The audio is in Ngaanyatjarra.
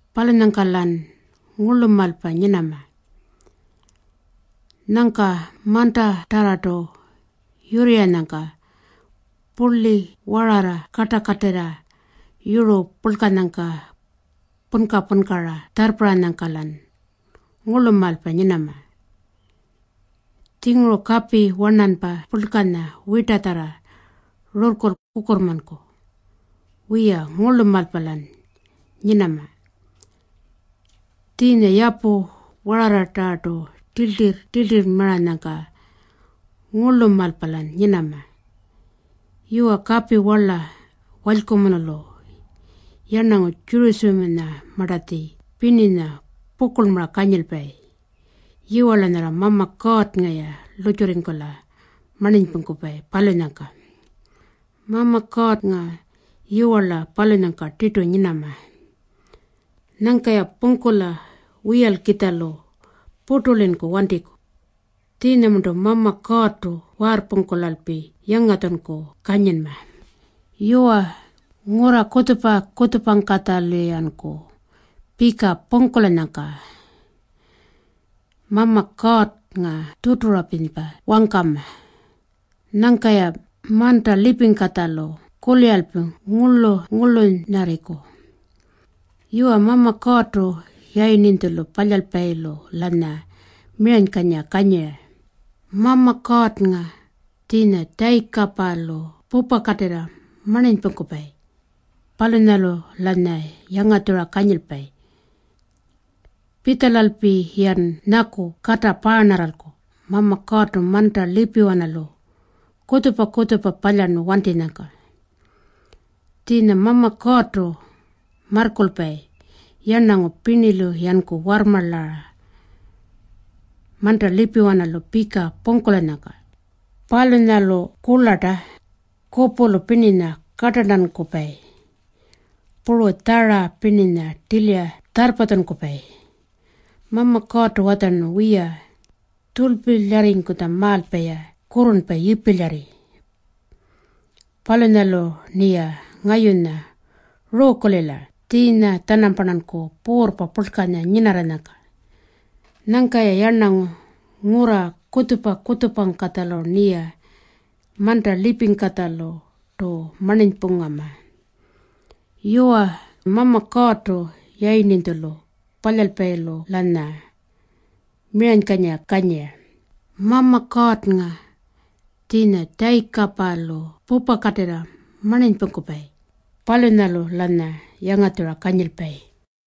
Palunyangka-lan ngurlumaalpa nyinama. Nyangka mantatarrartu yurrirranyangka purli wararra kartakatirra yuru purlkanyangka punka-punkara tjarrparranyangka-lan ngurlumaalpa nyinama. Tjinguru kapi warnanpa purlkanya wirtatjarra rurrku kukurrmanku. Wiya, ngurlumaalpa-lan nyinama. Tjiinya yapu wararratarrartu tiltirr-tiltirrmaranyangka, ngurlumaalpa-lan nyinama. Yuwa, kapi warla walykumunulu yarnangu Tjurutjamanyamartatji pirninya pukurlmara kanyilpayi. Yiwarla nyarra Mama Kuurrnga-ya lurrtjurringkula marninypungkupayi, palunyangka. Mama Kuurrnga yiwarla palunyangka tirtu nyinama. Nyangka-ya pungkula wiyalkitjalu purtulinku wantiku. Tjiinyamarntu Mama Kuurrtu waarrpungkulalpi yangatjunku kanyinma. Yuwa, ngurra kutjupa-kutjupangkatjalu-yanku pika pungkulanyangka Mama Kuurrnga tuturapirinypa wangkama. Nyangka-ya manta lipingkatjalu kuliralpi ngurluny-ngurlunyarriku. Yuwa, Mama Kuurrtu Yayirninytjulu Palyalpayilu-lanya miranykanyira kanyira. Mama Kuurrnga, tjiinya Tjayikapalu pupakatirra marninypungkupayi, palunyalu-lanya yangatjura kanyilpayi. Pitjalalpi-yan nyaku kata paarnarralku Mama Kuurrtu manta lipiwanalu kutjupa-kutjupa palyarnu wantinyangka. Tjiinya Mama Kuurrtu marrkulpayi yarnangu pirnilu-yanku warrmarlara manta lipiwanalu pika pungkulanyangka. Palunyalu kurlarta, kupulu pirninya kartarntankupayi, puru tjara pirninya tilira tjarrpatjunkupayi. Mama Kuurrtu watjarnu, “Wiya, tjurlpilyarrinytjamaalpa-ya kurrurnpa yipilyarri. Palunyalu-rniya ngayunya ruukulila tjiinya-tjanamparnanku puurrpa purlkanya nyinarranyangka. Nyangka yarnangu ngurra kutjupa-kutjupangkatjalu-rniya manta lipingkatjalurtu marninypungama.” Yuwa, Mama Kuurrtu Yayirninytjulu Palyalpayilu-lanya miranykanyira kanyira. Mama Kuurrnga, tjiinya Tjayikapalu pupakatirra marninypungkupayi, palunyalu-lanya yangatjura kanyilpayi.